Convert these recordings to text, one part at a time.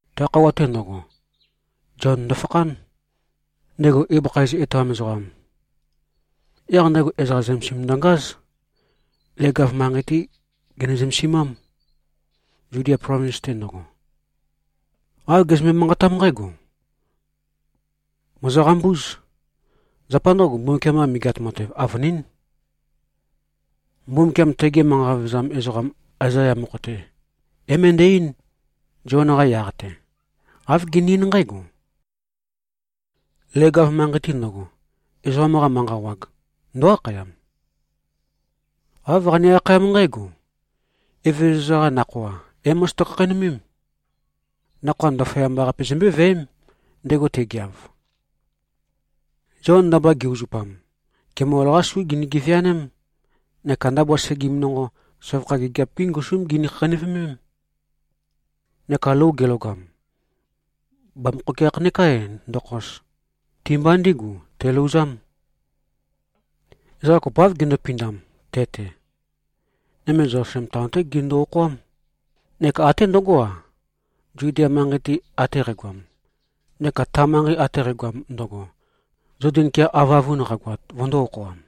Ta khøuwa-te ndøgo, Zion ndøfakhán, ndego ibøkha iz etoam ezoqam. Yaq ndego ezoqa zømesim ndøngáz. Leg-av manqei-té gene-zømesimám, Zudia plovins-te ndøgo. Āv gezømbe-manqatám nqǽgo, “Mòzoqambúz. Zapa ndǿgo, Mbumbukiam-qa Megeat Matev avønín.” Mbumbukiam tege manqa vevezam ezoqam Aezaya mokho-te, é-møndæ-eín, Zion-qa yaq-te. Āv gene-eín nqǽgo, “Leg-av manqei-te ndøgo, ezoqam-qa manqa wag ndǿ-akhayam. Āv qane-akhayám nqǽgo, ‘Evezøza-qa nakhoa é-mozoto-khakheinømém. Nakhoa ndaføyamba-qape zombøé-viæém, ndego te꞉geav.’” Zion, ndabua ge-uzupam, kemol-qá su gini-geveaném, neka ndabua segim nonqo, søvakha gigiap-gí ngusúm gini-khakheinøvemém. Neka lou gelogam, bamøkhokeakh neká ndokhos, ti-mba ndígu telouzám. Ezoqa kopoáv gindupindam te-te. Nøme Zelusalem taon-té gindu-okhoám, neka até ndøgó-a, Zudia manqei-te ate qægoam, neka ta manqei ate qægoam ndøgo, Zoden kea avøavun qagoat, vøndō-okhoam.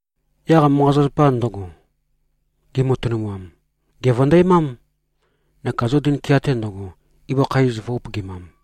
Yaq manqa-zapazapa ndøgo, gimatønumam, gèvøndæmám, neka Zoden kea-te ndøgo, ibøkha iz vø̄-upøgimam.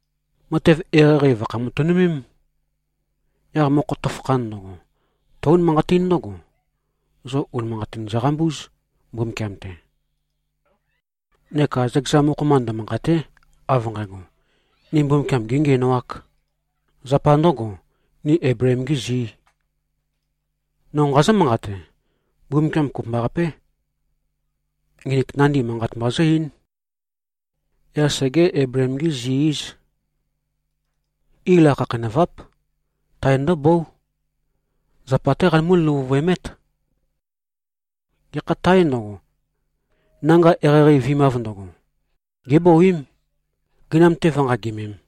Matev eqeieqei vø̀khæ-matønømém. Yaq mokho tøfakhan ndøgo, tǿ-unimanqatín ndǿgo, zo unimanqatin zoqambúz, Mbumbukiam-te. Neka zøkeza mokho-mba ndømanqàte᷄, av nqægo, ni Mbumbukiam gēngiænoāk, zapa ndø̄go, ni Eibleem-gī zī. No nqazǿ-manqate: Mbumbukiam kopømbaqapé, nginik nandi manqat mba zǿ-eín. Yaq segé-Eibleem-gí-zi-íz. Ila khakheinøváp. Tae ndǿbóu. Zapa-té qanømú-løvuvøemét. Gekha tāe ndøgo, nanga eqeieqei vi꞉mav ndøgo, gébouím, gøinam-te vǿnqagimēm.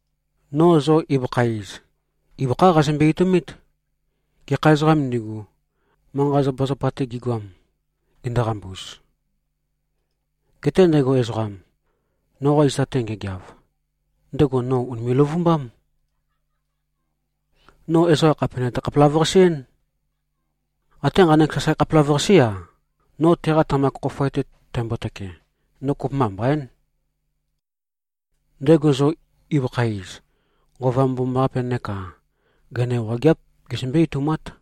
No zo ibøkha iz, ibøkhá qazømbe-etoumít, gekha ezoqām ndigu, manqa-zapazapa-te gigoam, ginduqambuz. Geté ndego ezoqam, noqa zita-te ngegeav, ndego no ùnime꞉-løvumbám. No ezoqa khàpe nøte-khapelavøqase-én. Até nqanek sasae khapelavøqasé-a, no teqa tamak khofoe-te tæmbotøke, no kopømba mbaín. Ndego zo ibøkha iz, Nqova Mbomambaqapé neka gøina wageáp gezømbé-etoumát.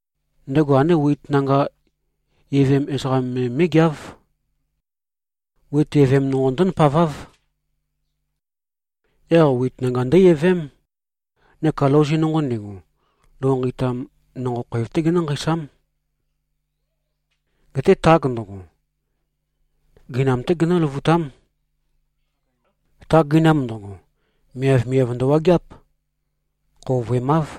Ndego andé wit nanga evem ezoqam me mé꞉geáv. Wit evem nonqo ndǿ-ndapaváv. Yaq wit nanga ndǿ-evém, neka louzi nonqo ndigu, lou nqeitam nonqo khoev-té genǿ-nqeisám. Geté tag ndøgo, gøinam-té genǿløvutám. Ta gøinam ndøgo, miavmiav ndøwageáp. Khouvøemáv.”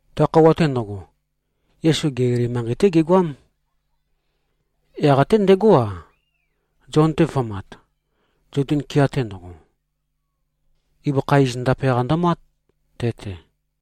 Ta khøuwa-te ndøgo, Yesu Gelili manqei-té gegoám. Yaq até ndegó-a, Zion-te vø̄mat, Zoden kea-te ndøgo. Ibøkha iz ndape-qa ndømát, te-te.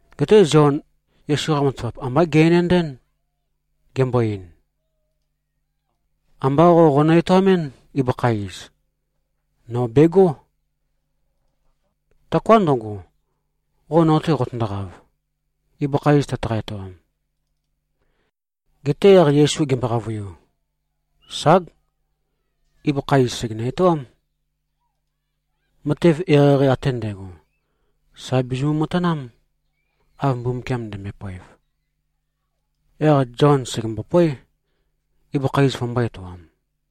Geté Zion Yesu-qa matavap ambá ge-enendɨ́n, gembo-ein, “Ambá qo qonø-etoamɨ́n, ibøkha iz. Nō begó. Taoká ndøgo, qo no-te qoqotøndoqav, ibøkha iz tøtaqa-etoam.” Geté yaq Yesu gembo-qavøiu, “Ság. Ibøkha iz sègenø-etoám. Matev eqeieqei ate ndægo, sà bizimu-matanám, av Mbumbukiam ndømbøe-poev.” Yaq Zion sègembopóe, ibøkha iz vømbō-etoam.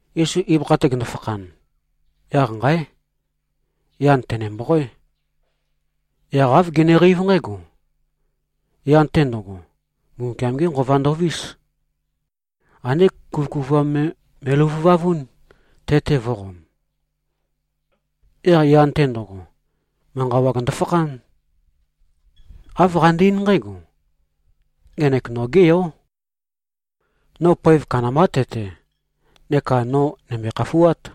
Yesu ibøkha-te gende-fakhan, yaq nqáe! Yan tø̀ne-mboqoé. Yaq āv geneqeív nqǽgo: Yan-te ndo꞉go, Mbumbukiam-gé Nqova ndovís. Andé kuvøkuvuam me me꞉løvuvavún, te-te vō꞉qom. Yaq yan-te ndo꞉go, manqa wag ndofakhán. Āv qande-eín nqǽgo, “Ngenek nogé yó. No poev kandambá te-te, neka no nø̀mbøe-khafuát.”